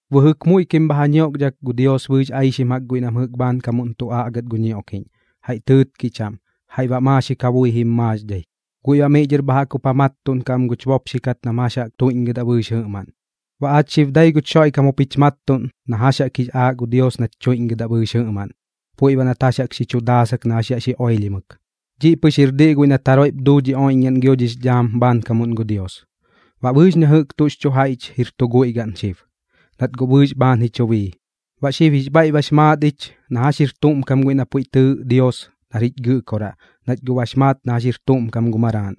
Bɨjɨk muiꞌkim bha ja ñioꞌkdhak gu Dios bɨɨx aixim jaꞌk guiꞌ nam jɨꞌk bhaankamuꞌn tu aꞌgat gu ñioꞌkiꞌñ, jaiꞌ tɨɨtkiꞌ chaꞌm, jaiꞌ baꞌ maaxik ja bui jim maaxdhai. Guiꞌ baꞌ miꞌ dhɨr bha jaꞌk jup ja mattuꞌnkaꞌ am guch bopxi kat nam jax jaꞌk tuiꞌñgɨdaꞌ bɨɨx jɨꞌmaꞌn. Baꞌ aach xib dai guch Xoiꞌkam jup jich mattuꞌn na jax jaꞌk jix aaꞌ gu Dios nach tuiꞌñgɨdaꞌ bɨɨx jɨꞌmaꞌn, puiꞌ baꞌ nat jax jaꞌk xi chu daasak na jax yaꞌ xi oilhimɨk. Dhiꞌ pɨx jir diꞌ guiꞌ nat jaroiꞌp duu dhi oiꞌñgaꞌn gio dhix dhaam bhaankamuꞌn gu Dios. Baꞌ bɨɨx na jɨꞌk tuꞌx chu jaiꞌch jir tu guiꞌ gaꞌn xib, nat guꞌ bɨɨx bhaan ji chu bii. Baꞌ xib jix bhaiꞌ bax maat ich na jax jir tuꞌm kam guiꞌ na puiꞌ tɨɨꞌ Dios nar jich Gɨꞌkoraꞌ, nach guꞌ bax maat na jax jir tuꞌm kam gu Maraaꞌn.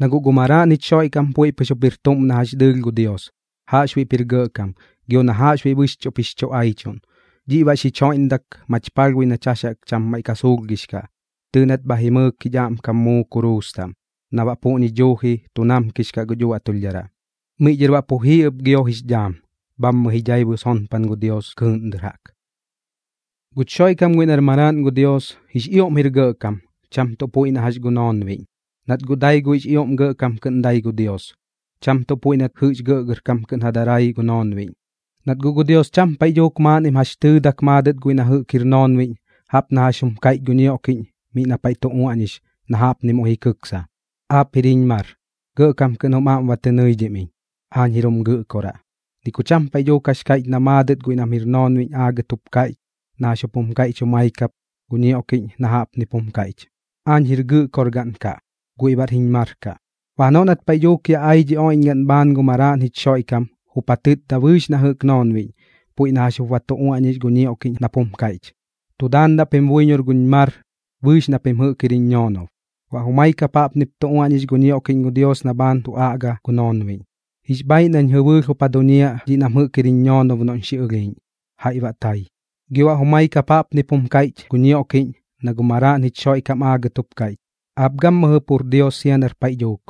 Na guꞌ gu Maraaꞌn jich Xoiꞌkam puiꞌ pɨx jup jir tuꞌm na jax dɨɨlh gu Dios, jaꞌxbuiꞌp jir gɇꞌkam, gio na jaꞌxbuiꞌ bɨxchuꞌp jix chu aichuꞌn. Dhiꞌ baꞌ xich joiꞌndak mach palhbui nach jax jaꞌk cham maiꞌ suulhgix kaꞌ, tɨɨꞌ nat bha jimɨɨk jich aꞌmkam muu kuruus taꞌm na baꞌ puꞌñi duuji tu namkix kaꞌ guch uaꞌtulhdharaꞌ. Miꞌ dhɨr baꞌ pu jii ɨp gio jix dhaam, bhammɨ ji dhaibu sonpan gu Dios kɨɨꞌn dɨr jaꞌk. Guch Xoiꞌkam guiꞌ nar Maraaꞌn gu Dios, jix ioꞌm jir gɇꞌkam, cham tuꞌ puiꞌ na jax gu noonbiꞌñ, nat guꞌ dai guiꞌx ioꞌm gɇꞌkam kɨꞌn dai gu Dios, cham tuꞌ puiꞌ nat jɨꞌx gɇꞌgɇrkam kɨꞌn ja darai gu noonbiꞌñ. Nat guꞌ gu Dios cham paiꞌ dhuuk maaꞌnnim jax tɨɨdak maadɨt guiꞌ nam jɨꞌk jir noonbiꞌñ jaꞌp na jax jum kaiꞌch gu ñioꞌkiꞌñ miꞌ na paiꞌ tu uaꞌñix, na jaꞌpni muiꞌ ji kiksa: Aap jir jiñ mar, gɇꞌkam kɨꞌn jum aꞌm ba tɨ nɨidhim iñ. Aañ jir jum gɨꞌkoraꞌ. Ni ku cham paiꞌ dhuuk jax kaiꞌch na maadɨt guiꞌ nam jir noonbiꞌñ aagɨt jup kaiꞌch na jax jup jum kaiꞌch jumai kap gu ñioꞌkiꞌñ na jaꞌpnip jum kaiꞌch: Aañ jir Gɨꞌkorgaꞌn kaꞌ, guiꞌ baꞌr jiñ mar kaꞌ. Baꞌ janoꞌ nat paiꞌ dhuuk yaꞌ ai dhi oiꞌñgaꞌn bhaan gu Maraaꞌn jich Xoiꞌkam, jup ja tɨtda bɨɨx na jɨꞌk noonbiꞌñ, puiꞌ na jax jup ba tu uaꞌñix gu ñioꞌkiꞌñ nap jum kaiꞌch: Tu daandaꞌ pim buiñor guñ mar bɨɨx na pim jɨꞌk jir jiñ ñoonob. Baꞌ jumai kap jaꞌpnip tu uaꞌñix gu ñioꞌkiꞌñ gu Dios na bhaan tu aꞌga gu noonbiꞌñ: Jix bhaaiꞌ nañ jɨbɨɨlh jup ja duñiaꞌ dhiꞌ nam jɨꞌk jir jiñ ñoonob noꞌñ xi ɨlhiiꞌñ, jaiꞌ baꞌ tai. Gio baꞌ jumai kap jaꞌpnip jum kaiꞌch gu ñioꞌkiꞌñ na gu Maraaꞌn jich Xoiꞌkam aagɨt jup kaiꞌch: Aap gammɨjɨ pur Dios sia nar paiꞌ dhuuk,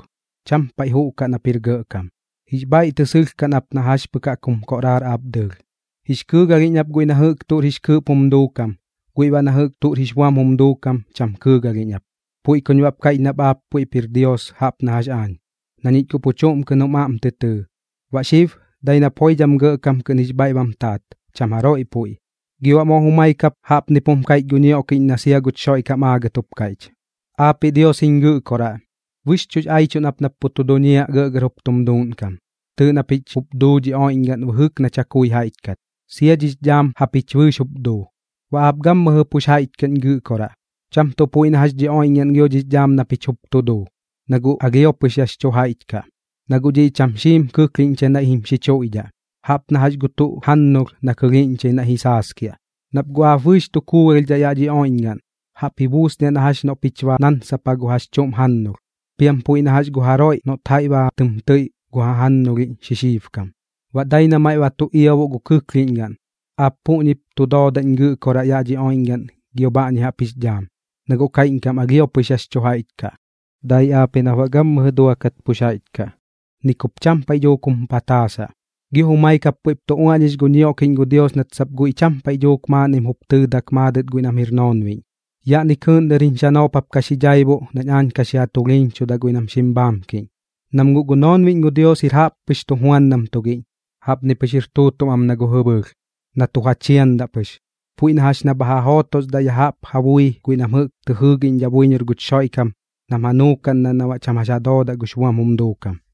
cham paiꞌ juꞌkaꞌ nap jir gɇꞌkam. Jix bhaiꞌ tɨ sɨlhkaꞌn ap na jax pɨk jaꞌk jum koꞌraar aap dɨɨlh. Jix kɨɨgalhiꞌñ ap guiꞌ na jɨꞌk tuꞌr jix kɨɨꞌp jum duukam, guiꞌ baꞌ na jɨꞌk tuꞌr jix buam jum duukam cham kɨɨgalhiꞌñ ap. Puiꞌ kuñ baꞌp kaiꞌch nap aap puiꞌp jir Dios jaꞌp na jax aañ, na ñich guꞌ pu chuꞌm kɨꞌn jum aꞌm tɨ tɨɨ. Baꞌ xib dai nap joidham gɇꞌkam kɨꞌn jix bhaiꞌ bam taat, cham jaroiꞌ puiꞌ. Gio baꞌ moo jumai kap jaꞌpnip jum kaiꞌch gu ñioꞌkiꞌñ na sia guch Xoiꞌkam aagɨt jup kaiꞌch: Aapiꞌ Dios jiñ Gɨꞌkoraꞌ, bɨxchuꞌx aichuꞌn ap nap pu tu duñiaꞌ gɇꞌgɇr jup tum duuꞌnkam. Tɨɨꞌ na pich jup duu dhi oiꞌñgaꞌn bɨjɨk na chakui jaiꞌch kat, sia dhix dhaam japich bɨɨx jup duu. Baꞌ aap gammɨjɨ pux jaiꞌch kaꞌñ Gɨꞌkoraꞌ, cham tuꞌ puiꞌ na jax dhi oiꞌñgaꞌn gio dhix dhaam na pich jup tu duu, na guꞌ alhio pɨx yax chu jaiꞌch kaꞌ. Na guꞌ dhiꞌ cham xiim kɨklhiꞌñchai naiꞌ jim xichuiꞌdhaꞌ, jaꞌp na jax gu tuꞌ jannulh na kɨlhiiꞌñchai naiꞌ ji saaskiaꞌ. Nap guꞌ aap bɨɨx tu kuugalhdhaꞌ yaꞌ dhi oiꞌñgaꞌn, jaꞌp ji buusniaꞌ na jax noꞌ pich ba nansapa gu jax chuꞌm jannulh, piam puiꞌ na jax gu jaroiꞌ noꞌt jaiꞌ ba tɨm tɨiꞌ gu jajannulhiꞌñ xixiibkam, baꞌ dai na maiꞌ ba tu iaboꞌ gu kɨklhiꞌñgaꞌn. Aap puꞌñip tu doodaꞌñ Gɨꞌkoraꞌ yaꞌ dhi oiꞌñgaꞌn gio bhaꞌñi jaꞌp jix dhaam, na guꞌ kaiꞌñkam alhio pɨx yax chu jaiꞌch kaꞌ. Dai aap ji nap baꞌ gammɨjɨ duakat pux jaiꞌch kaꞌ, ni kup cham paiꞌ dhuuk jum pataasaꞌ. Gio jumai kap puiꞌp tu uaꞌñix gu ñioꞌkiꞌñ gu Dios nat sap guiꞌ cham paiꞌ dhuuk maaꞌnnim jup tɨɨdak maadɨt guiꞌ nam jir noonbiꞌñ: Yaꞌni kɨɨꞌn dɨr jiñ xanoop jap ka xi dhaibuꞌ nañ aañ ka xi ja tulhiiñchudaꞌ guiꞌ nam xim bhaamkiꞌñ. Nam guꞌ gu noonbiꞌñ gu Dios jir jaꞌppɨx tujuandam tugiꞌñ, jaꞌpni pɨx jir tuutuꞌm am na gu jɨbɨɨlh, na tu ja chiandaꞌ pɨx. Puiꞌ na jax na bha ja jootosdaꞌ ya jaꞌp ja bui guiꞌ nam jɨꞌk tɨ jɨɨꞌñdhidhaꞌ buiñor guch Xoiꞌkam nam ja nuukaꞌndaꞌ na baꞌ cham jax ja doodaꞌ gux buam jum duukam.